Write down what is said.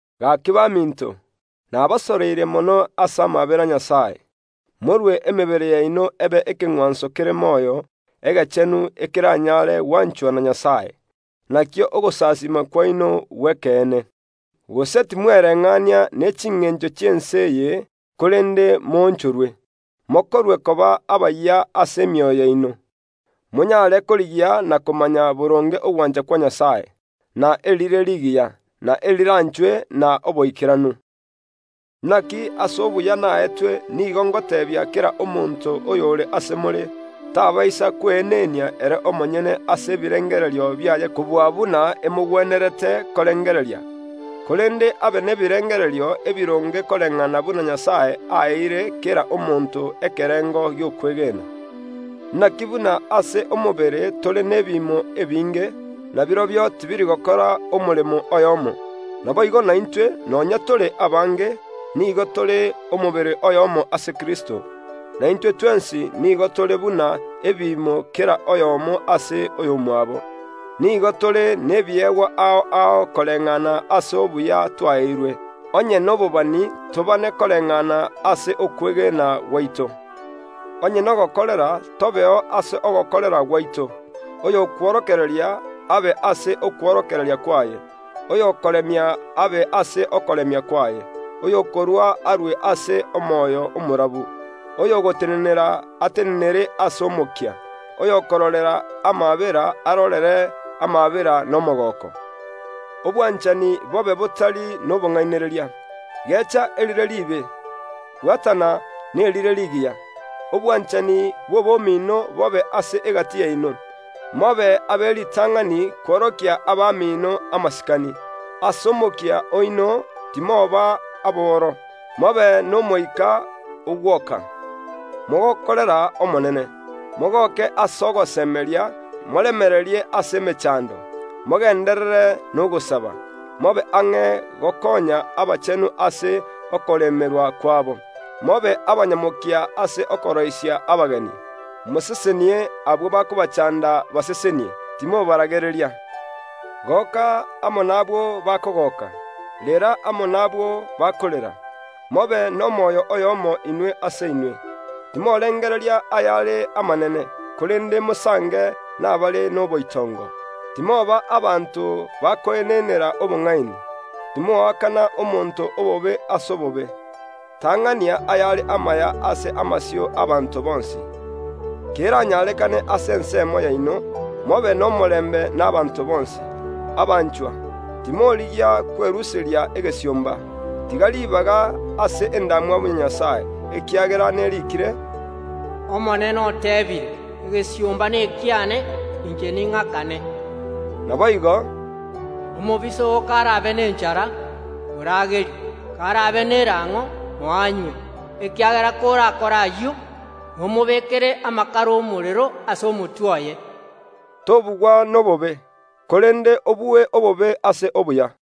Gaki baminto, nabasoroire mono ase amaabera a Nyasae, morue emebere yaino ebe ekeng’wanso kere moyo, egechenu, ekeranyare gwanchwa na Nyasae, nakio ogosasiima kwaino gw’ekeene. Gose timwereng’ania ne chingencho chi’ense eye; korende moonchorwe, mokorwe koba abayia ase emioyo yaino, monyare korigia na komanya boronge ogwancha kwa Nyasae, na erire rigiya, na eriranchwe, na oboikeranu. Inaki ase obuya naetwe nigo ngoteebia kera omonto oyore ase more, tabaisa kweenenia ere omonyene ase ebirengererio biaye kobua buna emogwenerete korengereria; korende abe n’ebirengererio ebironge koreng’ana buna Nyasae aeire kera omonto ekerengo gi’okwegena. Inaki buna ase omobere tore nebiimo ebinge, na birobio tibiri gokora omoremo oyomo; naboigo naintwe, nonya tore abange, nigo tore omobere oyomo ase Kristo, na intwe twensi nigo tore buna ebiimo kera oyomo ase oy’omwabo. Nigo tore nebiegwa ao ao koreng’ana n’obuya twaeirwe; onye n’obobani tobane koreng’ana n’okwegena gwaito; onye n’ogokorera, tobeo ase ogokorera gwaito; oyo okworokereria abe ase okworokereria kwaye; oyo okoremia abe ase okoremia kwaye; oyo okorua arue ase omoyo omorabu; oyo ogotenenera atenenere ase omokia; oyo okororera amaabera arorere amaabera n’omogooko. Obwanchani bobe botari n’obong’ainereria. Gecha erire riibe, bwatana n’erire rigiya. Obwanchani bw’obomino bobe ase egati yaino; mobe ab’eritang’ani kworokia abamino amasikani. Ase omokia oino timoba aboro; mobe n’Omoika ogwoka, mogokorera Omonene. Mogoke ase ogosemeria, moremererie ase emechando, mogenderere n’ogosaba. Mobe ang’e gokoonya abachenu ase okoremerwa kwabo, mobe abanyamokia ase okoroisia abageni. Mosesenie abwo bakobachaanda; basesenie, timobaragereria. Goka amo nabwo bakogoka; rera amo nabwo bakorera. Mobe n’omoyo oyomo inwe ase inwe. Timorengereria ayare amanene, korende mosange n’abare n’oboitongo. Timoba abanto bakoenenera obong’aini. Timoakana omonto obobe ase obobe, tang’ania ayare amaya ase amasio y’ abanto bonsi. Keranyarekane ase ensemo yaino, mobe n’omorembe n’abanto bonsi. Abanchwa, timorigia kweruseria egesiomba, tiga ribaga ase endamwamu ya Nyasae, ekiagera neriikire, “Omonene oteebire: Egesiomba n’ekiane; inche ning’akane.” Naboigo, “Omobisa oo karabe nenchara, moragerie, kar’abe n’erang’o, moe anywe, ekiagera korakore ayio, nomobekere amakara y’omorero ase omotwe oye.” Tobugwa n’obobe, korende obue obobe ase obuya.